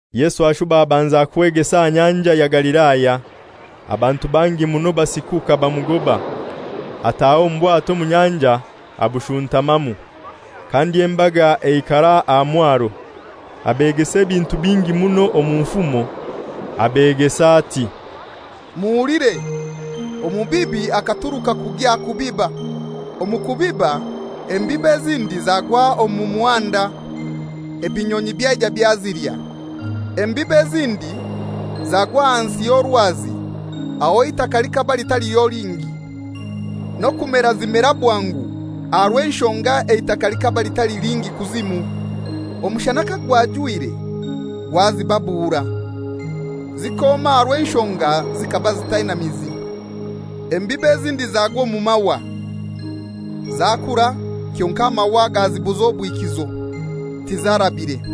Yesu ashuba abanza kwegesa aha Nyanja ya Galilaya. Abantu bangi muno basikuka bamugoba, ataha omu bwato omu nyanja abushuntamamu. Kandi embaga eikara aha mwaro. Abegesa ebintu bingi muno omu nfumo; abegesa nagamba ati, «Muhulire! Omubibi akaturuka kugya kubiba. Omu kubiba, embibo ezindi zagwa omu muhanda, ebinyonyi byaija byazilya. Embibo ezindi zagwa aha nsi ey'orwazi, aho eitaka likaba litaliho lingi, n'okumera zimera bwangu aha rw'enshonga eitaka likaba litali lingi kuzimu. Omushana kagwajwire gwazibabuura. Zikoma aha rw'enshonga zikaba zitaina mizi. Embibo ezindi zagwa omu mahwa, zakura, kyonkai amahwa gazibuza obwikizo, tizarabire.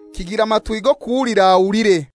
Kigira matwi g'okuhulira ahulire.»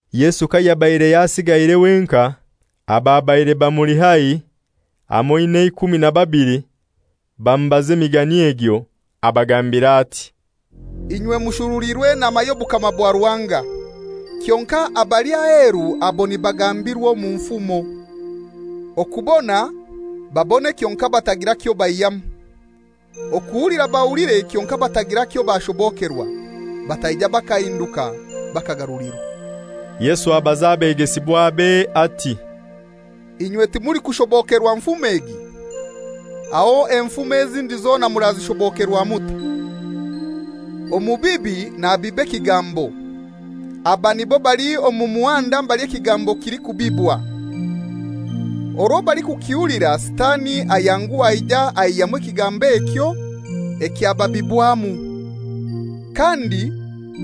Yesu kayabaire yasigaire wenkai, ababaire bamuli haihi, hamoi n'eikumi na babili, bamubaza emigani egyo. Abagambira ati, «Inywe mushuruliirwe enama y'obukama bwa Ruhanga, kyonkai abali aheru abo nibagambirwa omu nfumo. Okubona babone kyonkai batagira kyobaihyamu, okuhulira bahulire kyonkai batagira kyobashobokerwa, bataija bakahinduka bakagarulirwa.» Yesu abaza abegesibwabe ati, «Inywe timulikushobokerwa nfumo egi? Aho enfumo ezindi zona murazishobokerwa mutai? Omubibi nabiba ekigambo. Aba nibo bali omu muhanda mbali ekigambo kilikubibwa. Orwo balikukihulira Sitani ayanguha aija aihyamu ekigambo ekyo ekyababibwamu. Kandi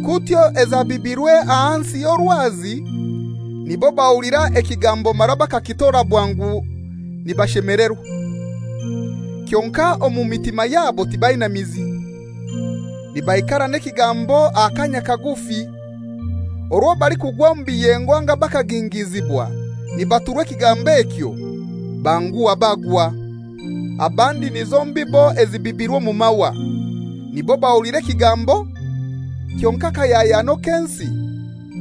kutyo ezabibirwe aha nsi ey'orwazi nibo bahulira ekigambo mara bakakitora bwangu nibashemelerwa. Kyonkai omu mitima yabo tibaina mizi. Nibaikara n'ekigambo akanya kagufi. Orwo balikugwa omu biyengo anga bakagingizibwa nibaturwa ekigambo ekyo, banguha bagwa. Abandi nizo mbibo ezibibirwe omu mahwa. Nibo bahulira ekigambo, kyonkai akahyahyano k'ensi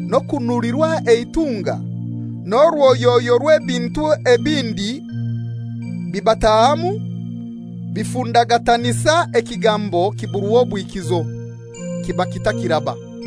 n'okunulirwa eitunga, n'orwoyoyo rw'ebintu ebindi bibatahamu bifundagatanisa ekigambo kiburwa obwikizo, kiba kitakiraba.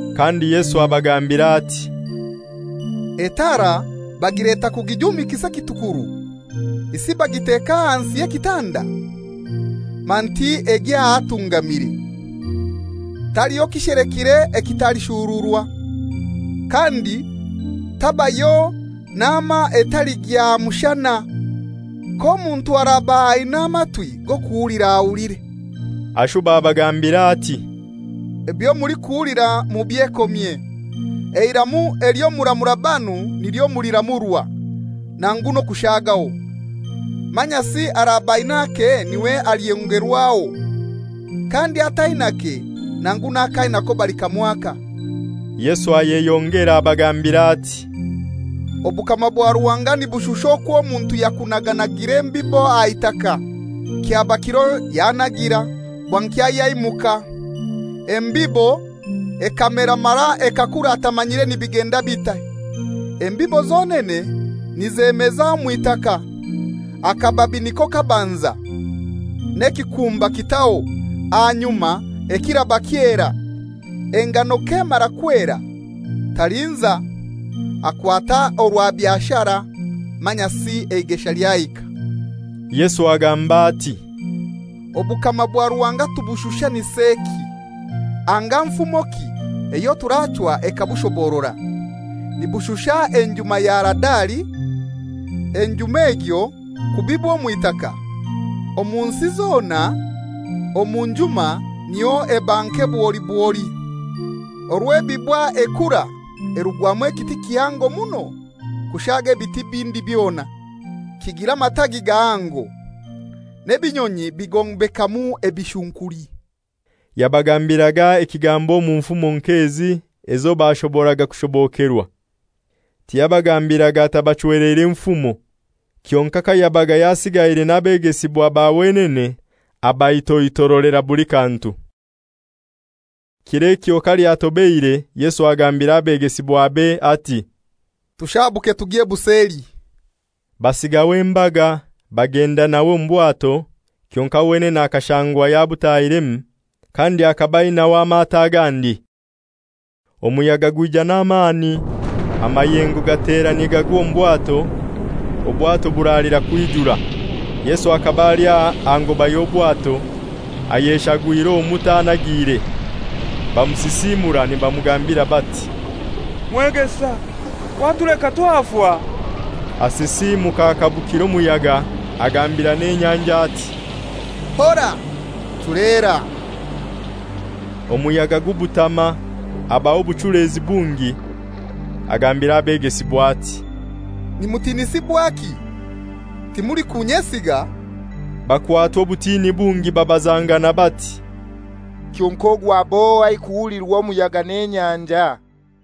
Kandi Yesu abagambira ati, «Etaara bagileta kugijumikiza ekitukuru? Isi bagiteka ahansi y'ekitanda? Manti egya ahatungamire. Taliho kishelekire ekitalishururwa. Kandi tabayo nama etaligya aha mushana. K'omuntu araba aina amatwi g'okuhulira, ahulire.» Ashuba abagambira ati, «Ebyo mulikuhulira mubyekomye! Eiramu elyo muramura banu nilyo muliramurwa, nangu n'okushagaho. Manyasi araba ain'ake n'iwe alyongerwaho; kandi atainake, nangu n'ak'ainako balikamwaka.» Yesu ayeyongera abagambira ati, «Obukama bwa Ruhanga nibushusha okwo omuntu yakunaganagire embibo aha itaka, kyaba kiro yanagira, bwankya yaimuka, embibo ekamera mara ekakura atamanyire nibigenda bitai. Embibo zonene nizemeza omw'itaka. Akababi niko kabanza, n'ekikumba kitaho, ahanyuma ekiraba kyera. Engano k'emara kwera, talinza, akwata orwabyo ashara, manyasi eigesha lyahika.» Yesu gamba ati, «Obukama bwa Ruhanga tubushushaniseki, anga nfumoki eyo turachwa ekabushoborora? Nibushusha enjuma ya Haradali. Enjuma egyo kubibwa omu itaka, omu nsi zona omu njuma niyo eba nke bwoli bwoli. Orwo ebibwa ekura erugwamu ekiti kihango muno kushaaga ebiti ebindi byona, kigira amatagi gahango, n'ebinyonyi bigombekamu ebishunkuli.» Yabagambiraga ekigambo omu nfumo nk'ezi ezo bashoboraga kushobokerwa. Tiyabagambiraga atabachweleire nfumo, kyonkai kayabaga yasigaire n'abegesibwa ba wenene abaitoitorolera buli kantu. Kir'ekyo kalyatobeire Yesu agambira abegesibwabe ati, «Tushabuke tugye buseli.» Basigaho embaga, bagenda nawe omu bwato, kyonkai wenene akashangwa yabutahiremu. Kandi akaba ainaho amato agandi. Omuyaga gwija n'amani, amayengo gatera nigagwa omu bwato, obwato buralira kwijura. Yesu akaba ali aha ngoba y'obwato, ayeshagwire omuto anagiire. Bamusisiimura nibamugambira bati, «Mwegesa, watuleka twafa?» Asisiimuka akabukira omuyaga, agambira n'enyanja ati, «Hora! Chuleera!» Omuyaga gubutama, habaho obuchulezi bungi. Agambira abegesibwa ati, «Nimutinisibwaki? Timulikunyesiga?» Bakwatwa obutini bungi babazangana bati, «Kyonkai ogu ab'ohai, kuhulirwa omuyaga n'enyanja?»